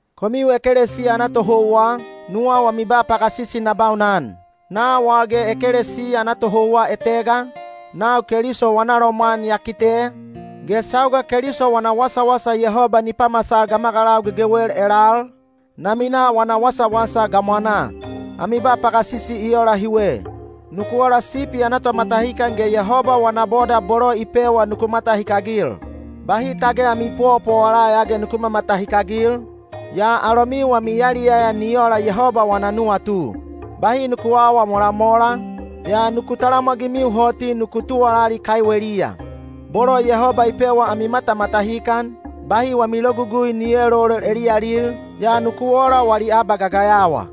Komiu ekelesiya ana tohouwa, nuwau ami ba pagasisi na baunan. Nau al ge ekelesiya ana tohouwa etega, nau Keliso wana lomwan ya kite, ge sauga Keliso wana wasawasa Yehoba ni pamasal gamagalau gegewel elal, na minaa wana wasawasa gamwanaa. Ami ba pagasisi i ola hiwe: nuku ola sipi ana tomatahikan ge Yehoba wana boda bolo i pewa nuku matahikagil. Bahi tage ami powapowala ya ge nuku mamatahikagil, yaa alomiu wami yaliyaya ni ola Yehoba wana nuwatu. Bahi nuku aawa molamola, yaa nuku talamwagimiu hoti nuku tuwalali kaiweliya. Bolo Yehoba i pewa ami matamatahikan, bahi wami logugui ni eelolol eliyalil, yaa nuku ola wali abagagayawa.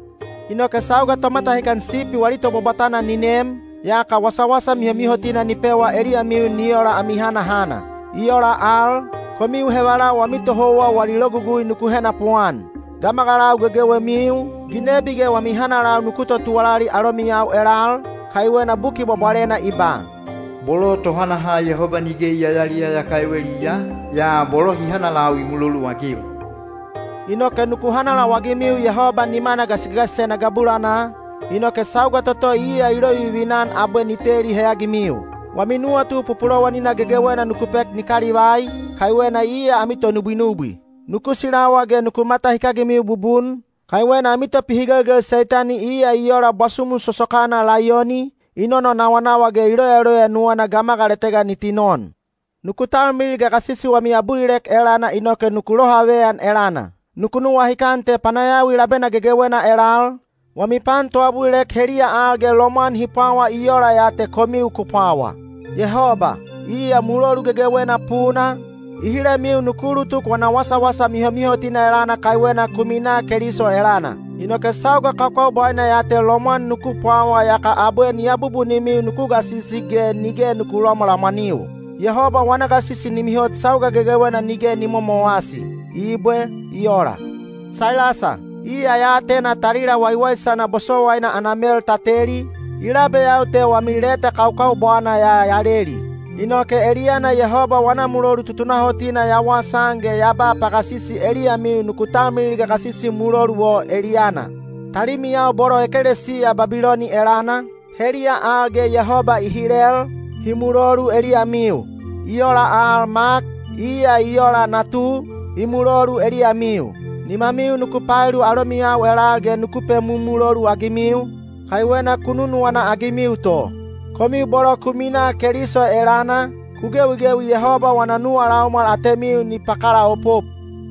Inoke sauga Tomatahikan Sipi wali Tobwabwatana ni nem, yaka wasawasa mihomihotina ni pewa eliyamiu ni ola ami hanahana. I ola al, komiu hevalau wami tohouwa wali logugui nuku henapuan. Gamagalau gegewemiu, ginebi ge wami hanalau nuku totuwalali alomiyau elal, kaiwena Buki Bwabwalena i ba: Bolo tohanaha Yehoba nige i yayaliyaya kaiweliya, yaa bolo hi hanalau i muloluagil. Inoke nuku hanalau-agimiu Yehoba nimana gasigasisena gabulanaa, inoke sauga toto iya i lovivina-an abwe ni teli heyagimiu. Wami nuwatu pupulowanina gegewena nuku pek ni kalivai, kaiwena iya ami tonubwinubwi. Nuku silawa ge nuku matahikagimiu bubun, kaiwena ami topihigelgel Seitani iya i ola bwasumu sosokana laiyoni, i nononawanawa ge i loyaloya nuwana gamagal etega ni tinon. Nuku talmilil gagasisi wami abulilek elana inoke nuku lohaveyan elana. Nuku nuwahikan te panayawi labena gegewena elal, wami pan toabulilek heliya al ge lomwan hi pwawa i ola ya te komiu ku pwawa. Yehoba, iya mulolu gegewena puna, i hilemiu nuku ulutuk wana wasawasa mihomihotina elana kaiwena ku minaa Keliso elana. Inoke sauga kakaubwaina ya te lomwan nuku pwawa yaka abwe ni abubunimiu nuku gasisi ge nige nuku lamwalamwaniu. Yehoba wana gasisi ni mihot sauga gegewena nige ni momowasi. Ibwe. I ola. Sailasa, iya ya atena talila waiwaisana bosowaina ana mel ta teli, i labeyau te wami leta kaukaubwana ya ya leli. Inoke eliyana Yehoba wana mulolu tutunahotina ya wasaan ge ya ba pagasisi eliyamiu nuku talmilil gagasisi mulolu o eliyana. Talimiyau bolo ekelesiya Babiloni elana, heliya al ge Yehoba i hilel, hi mulolu eliyamiu. I ola al Mak, iya i ola natu, i mulolu eliyamiu. Nimamiu nuku paelu alomiyau elal ge nuku pemumulolu-agimiu, kaiwena ku nunuwana-agimiu to. Komiu bolo ku minaa Keliso elana, ku gewigewi Yehoba wana nuwa laumwal atemiu ni pakalaopop.